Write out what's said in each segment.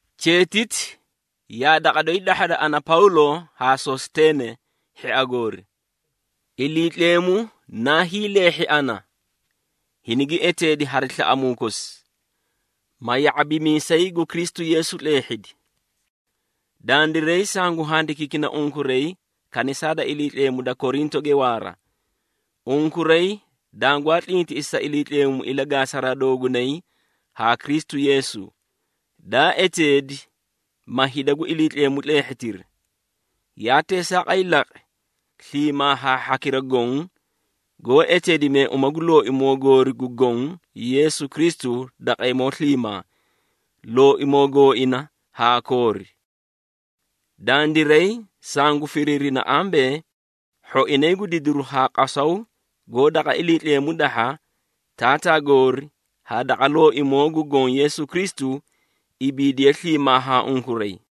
Cheetiti yaa daqa doyi dahhada, ana Pawlo haa Sositeene hhia goori. Iliitleemu naa hiileehhi ana, hinigi eteedi hari slaꞌamuu kosi, ma ya⁄abimiisay gu Kristu Yeesu tleehhidi. Dandiray sangu handikiikina unkuray kanisaa da Iliitleemu da Korintoge waara. Unkuray dangwaa tlintiꞌisi sa Iliitleemu ilagaasaraa doogunay haa Kristu Yeesu, daa eteedi, ma hida gu Iliitleemu tleehhitiri. Yaa teesaaqay laqi, sliimaa haa hhakira goõ, goó eteedimee uma gu Looimoo goori gu Goõ Yeesu Kristu daqeemoo sliimaa, Looimoo gooina haa koori. Dandiray sangu firiirina ambee, hhoinay gu didiru haa qasaw goó daqa Iliitleemu dahha, Taataa goori haa daqa Looimoo gu Goõ Yeesu Kristu, ibiidiye sliimaa haa unkuray.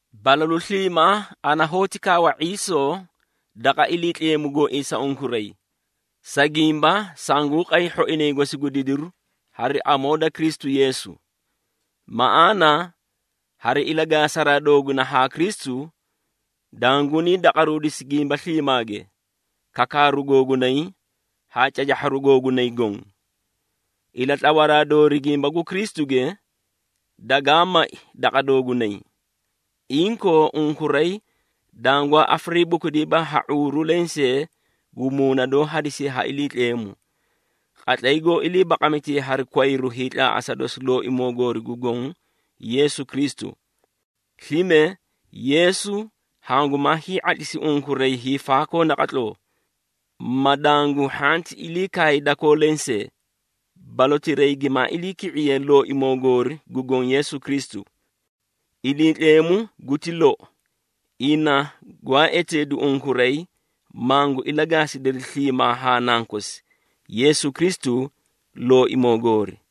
Balalu sliimaa ana hoóti kawa ⁄iisoo daqa Iliitleemu gooii sa unkuray, sa gimba sanguũ qay hhoinay gosi gu didiru hari amoo da Kristu Yeesu. Maꞌaana hari ilagaasaraa doogunay haa Kristu, dangunii daqaruudisi gimba sliimaage, kakaaru googunay haa cacahharu googunay goõ. Ilatlawaraa doori gimba gu Kristuge, dagaa mai daqa doogunay. Inkoo, unkuray dangwaa afariibukudiiba ha ⁄uuru lensee gu muuna doó hadisiye ha Iliitleemu, qatlay goó ilii baqamitee hari kwayru hiitlaaꞌasa dosi Looimoo goori gu Goõ Yeesu Kristu. Slime, Yeesu hangumaa hii⁄atlisi unkuray hiifaakoo naqatloo, ma dangu hhanti ilii kaay dakoo lensee, balotirayi gimaa iliiki⁄iye Looimoo goori gu Goõ Yeesu Kristu. Iliitleemu guti lou, ina gwaa eteedu unkuray, mangu ilagaasidiri sliimaa haa Nankosi, Yeesu Kristu, Looimoo goori.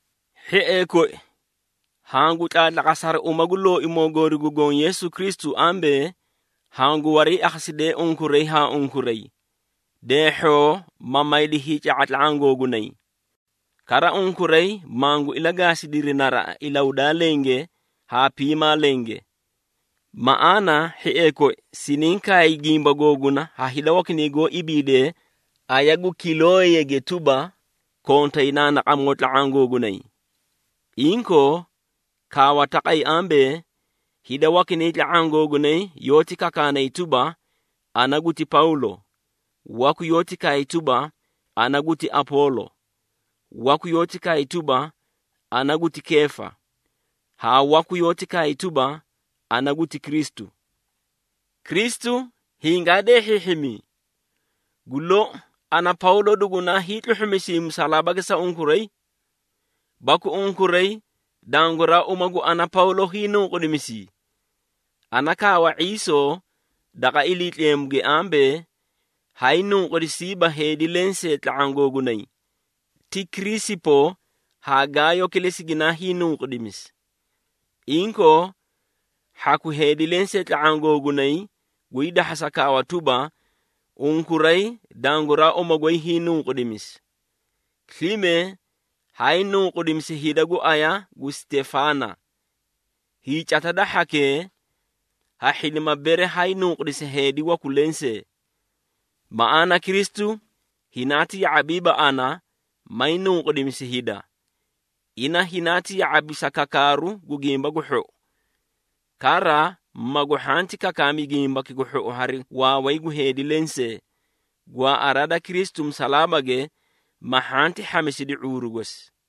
Hhiee koi, hangu tlaatlaqasa hari uma gu Looimoo goori gu Goõ Yeesu Kristu ambee, hangu wariiakhasidee unkuray haa unkuray, deehhoo ma maydi hiica⁄a tla⁄aã googunay. Kara unkuray, mangu ilagaasidiri naraꞌa ilahudaa lenge haa piimaa lenge. Maꞌaana hhiee koi, siniĩ kaay gimba googuna ha hida wakinay goó ibiide aya gu Kilooyege tuba, kontay naanaaqamoo tla⁄aã googunay. Inkoo, kaawa taqay ambee, hida wakinay tla⁄aã googunay yoóti kakaanay tuba, “Ana guti Pawlo,” waku yoóti kaay tuba, “Ana guti Apoolo.” Waku yoóti kaay tuba, “Ana guti Keefa,” haa waku yoóti kaay tuba, “Ana guti Kristu.” Kristu hingaa deehhiihhimii? Gu lou, ana Pawlo dugunaa hiitluhhumisii musalaabage sa unkuray? Baku unkuray danguraa uma gu ana Pawlo hiinunqudimisii? Ana kaawa ⁄iisoo daqa Iliitleemuge ambee, haay nunqudisiiba heedi lensee tla⁄aã googunay, ti Kiriisipo haa Gaayo kilesi ginaay nunqudimisi. Inkoo, hhaku heedi lensee tla⁄aã googunay gwii dahhasa kaawa tuba, unkuray danguraa uma goy hiinunqudimisi. (Slime haay nunqudimisi hida gu aya gu Sitefaana. Hiicata da hhakee, ha hhidima bere haay nunqudisi heedi waku lensee.) Maꞌaana Kristu hinaati ya⁄abiiba ana, may nunqudimisi hida. Ina hinaati ya⁄abi sa kakaaru gu Gimba gu Hhou. Kara magu hhanti kakaami Gimbaki gu Hhou hari waaway gu heedi lensee, gwaaꞌaraa da Kristu musalaabage, ma hhanti hhamisidi ⁄uuru gosi.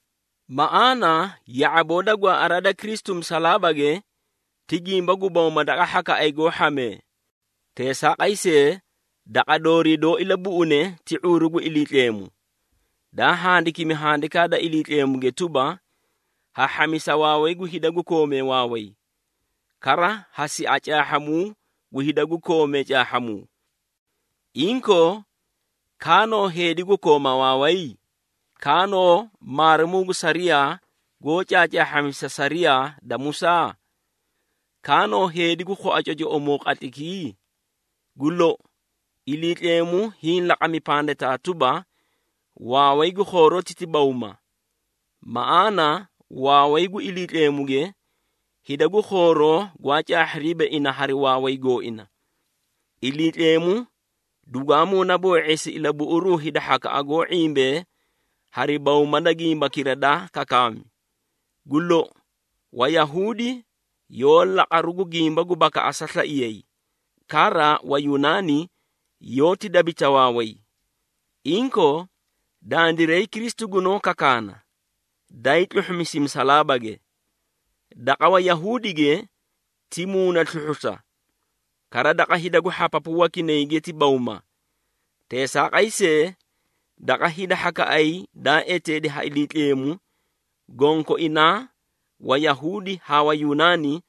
Maꞌaana ya⁄aboo da gwaaꞌaraa da Kristu musalaabage ti gimba gu bawma daqa hhakaꞌay goó hhamee. Teesaaqay see, daqa doori doó ilabuꞌune ti ⁄uuru gu Iliitleemu. Daa handikimi Handikaa da Iliitleemuge tuba, “Ha hhamisa waaway gu hida gu koomee waaway. Kara ha sia caahhamuu gu hida gu koomee caahhamuu.” Inkoo, kaanoo heedi gu kooma waaway? Kaanoo maarimuu gu sariyaa, goó caacaahhamisa sariyaa da Musaa? Kaanoo heedi gu khua cocoꞌomoo qatlaykii? Gu lou, Iliitleemu hiĩ laqami pandataa tuba, waaway gu khooroti ti bawma! Maꞌaana waaway gu Iliitleemuge, hida gu khooroo gwaa caahhiriiba ina hari waaway gooina. Iliitleemu dugwaa muunaboo⁄eesi ilabuꞌuruu hhakaꞌa goó ⁄imbee hari bawma da gimbakira daa kakaami. Gu lou, Wayahuudi yoó laqaru gu gimba gu bakaꞌasa slaiyay, kara Wayunaani yoóti dabita waaway. Inkoo, dandiray Kristu gunoó kakaana, daay tluhhumisi musalaabage. Daqa Wayahuudige ti muuna sluhhusa, kara daqa hida gu hhapapu wakinayge ti bawma. Teesaaqay see, daqa hida hhakaꞌay daa eteedi ha Iliitleemu, gonkoinaa Wayahuudi haa Wayunaani,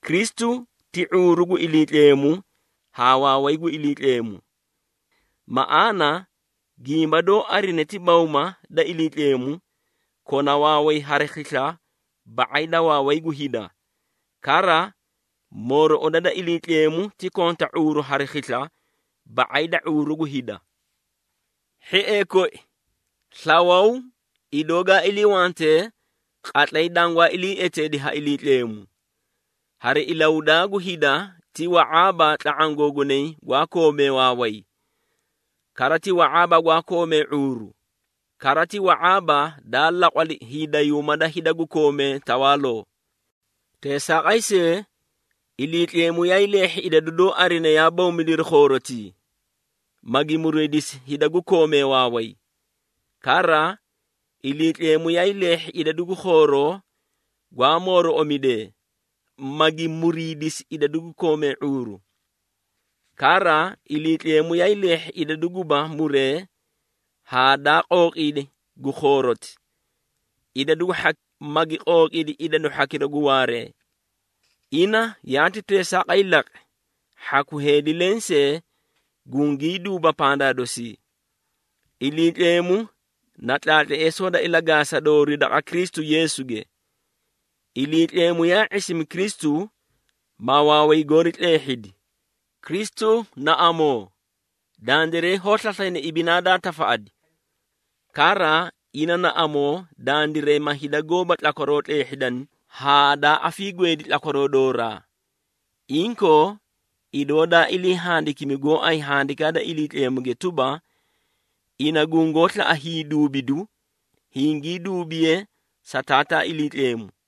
Kristu ti ⁄uuru gu Iliitleemu haa waaway gu Iliitleemu. Maꞌaana, gimba doó arine ti bawma da Iliitleemu kona waaway hari khisla ba⁄ay da waaway gu hida. Kara, mooroꞌoda da Iliitleemu ti konta ⁄uuru hari khisla ba⁄ay da ⁄uuru gu hida. Hhiee koi, slawaw, idoo gaa iliiwante qatlay dangwaa ilii eteedi ha Iliitleemu. Hari ilahudaa gu hida ti wa⁄aaba tla⁄aã googunay gu koomee waaway. Kara ti wa⁄aaba gu koomee ⁄uuru, kara ti wa⁄aaba daa laqwali hiidayuuma da hida gwaa koomee tawaaloo. Teesaaqay see, Iliitleemu yaay leehhi idadu doó arine yaa bawmidiri khoorotii, magi muriidisi hida gu koomee waaway. Kara Iliitleemu yaay leehhi idadu gu khooroo gwaa mooroꞌomidee, magi muriidisi idadu gu koomee ⁄uuru. Kara Iliitleemu yaay leehhi idadu guba muree haa daa qooqiidi gu khooroti, idadu gu hhaki, magi qooqiidi idadu hhakira gu waaree. Ina yaati teesaaqay laqi, hhaku heedi lensee gungii duuba pandaa dosii. Iliitleemu na tlaatleesoo da ilagaasa doori daqa Kristu Yeesuge. Iliitleemu yaa ⁄isimi Kristu, ma waaway goori tleehhidi. Kristu na amoo dandiray hoó slaslayna ibinaa daa tafaꞌadi. Kara, ina na amoo dandiray, ma hida goóba tlakwaroo tleehhidani, haa daa afiigweedi tlakwaroo dooraa. Inkoo, idoo daa ilii handikimi gooay Handikaa da Iliitleemuge tuba, “Ina gungoó slaꞌa hiiduubidu, hingii duubiye sa Taataa Iliitleemu.”